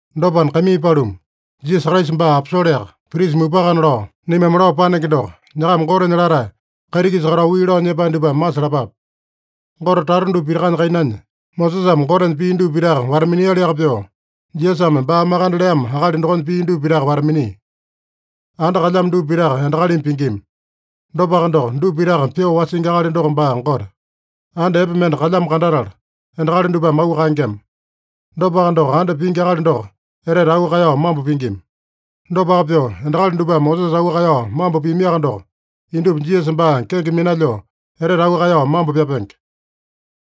Dopana, kaimii paluma, Jisasa Kraisa baa aposoleaka, prisa mupakana lao, naimame lao panenge doko, nyakama Gotenya latae, kaiti-kisa katao wii lao nyepae dupame masalapape. Gote tata dupa pitakanya kainanya, Mosesame Gotenya pii dupa pitaka wata-minialiaka pyoo, Jisasame baa makande leamo akali dokonya pii dupa pitaka wata-minia. Anda kalyamo dupa pitaka endakalimi pingima. Dopaka doko, dupa pitaka pyoo wasingi akali doko baa Gote. Anda epe mende kalyamo kandatala, endakali dupame auu kaengema. Dopaka doko, anda pingi akali doko etete auu kaeyao mambo pingima. Dopaka pyoo, endakali dupame Mosesa auu kaeyao mambo piamiaka doko, indupa Jisasa baa kenge minalyoo etete auu kaeyao mambo pyapenge.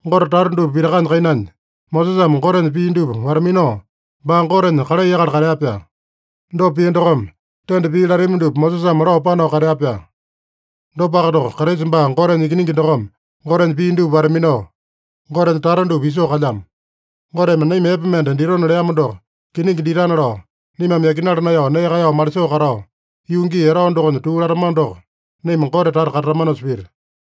Gote tata dupa pitakanya kainanya, Mosesame Gotenya pii dupa wata-minao, baa Gotenya kalai akali katea-pyaa. Dopa pia dokome, tenda pii latami dupa Mosesame lao panao katea-pyaa. Dopaka doko, Kraisa baa Gotenya Ikiningi dokome Gotenya pii dupa wata-minao, Gotenya tata dupa isoo kalyamo. Goteme naima epe mende ditona leamo doko kiningi ditana lao, naimame yakinala naeyao nee kaeyao malisoo katao, yuu gii etao dokonya tuu latamano doko, naima Gote tata katatamanosa pita.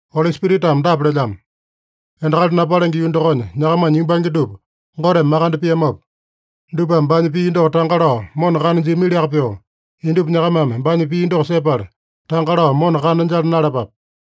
Oli Spiritame dapa lelyamo: “Endakali napalenge yuu dokonya nyakamanya yumbange dupa Goteme makande piamopa, dupame baanya pii doko tanga lao mona kana jiamiliaka pyoo, indupa nyakamame baanya pii doko sepala, tanga lao mona kana jala naeyalapape.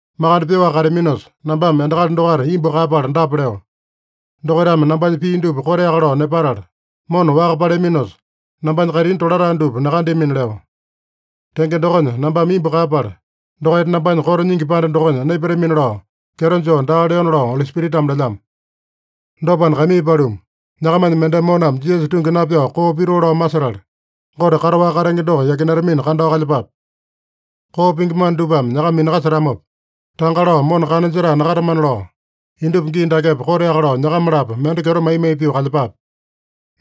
Makande pyoaka kateaminosa, nambame endakali dokaita imbu kaeyapala dapa leo: ‘Dokaitame nambanya pii dupa koteaka lao nepatala mona waka paleaminosa, nambanya kaitini tolatae dupa nakandeamina’ leo. Tenge dokonya, nambame imbu kaeyapala, ‘Dokaita nambanya koto nyingi panda dokonya naipatamina’ lao kyeto joo daa leona” lao Oli Spiritame lelyamo. Dopana, kaimii paluma, nyakamanya mendeme moname Jisasa tungi napyao koo pitoo lao masetala, Gote kataowaka katenge doko yakinatamina kandao kalyepape. Koo pingi mana dupame nyakama minakasetamopa, tanga lao mona kana jetae nakatamana lao, indupa gii dakepa koteaka lao nyakama-lapo mende kyeto mai-mai pyoo kalyepape.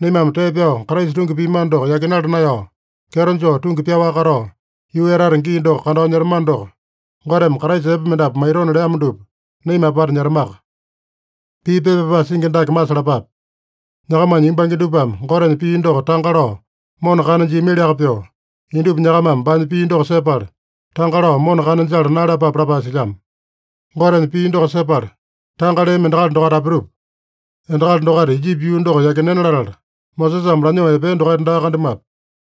Naimame tee pyao Kraisa tungi piamano doko yakinala naeyao, kyeto joo tungi pyaowaka katao, yuu etata gii doko kandao nyetamano doko, Goteme Kraisa epe mendapu maitona leamo dupa, naima apata nyetamaka. Pii pepa pyapae singi dake masalapape: “Nyakamanya yumbange dupame Gotenya pii doko tanga lao mona kana jiamiliaka pyoo, indupa nyakamame baanya pii doko sepala, tanga lao mona kana jala naeyalapape” lapae silyamo. Gotenya pii doko sepala tanga leami endakali dokaita apitupa? Endakali dokaita Ijipi yuu doko yakinena latala, Mosesame lanyoo epea dokaita daa kandamuape.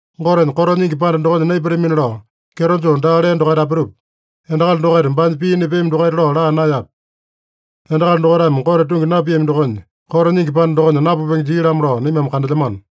Gotenya koto nyingi panda dokonya naipatamina lao kyeto joo daa lea dokaita apitupa? Endakali dokaita baanya pii nepeami dokaita lao laa naeyape? Endakali dokaitame Gote tungi napiami dokonya, koto nyingi panda dokonya napupenge jia-lamo lao naimame kandelyamano.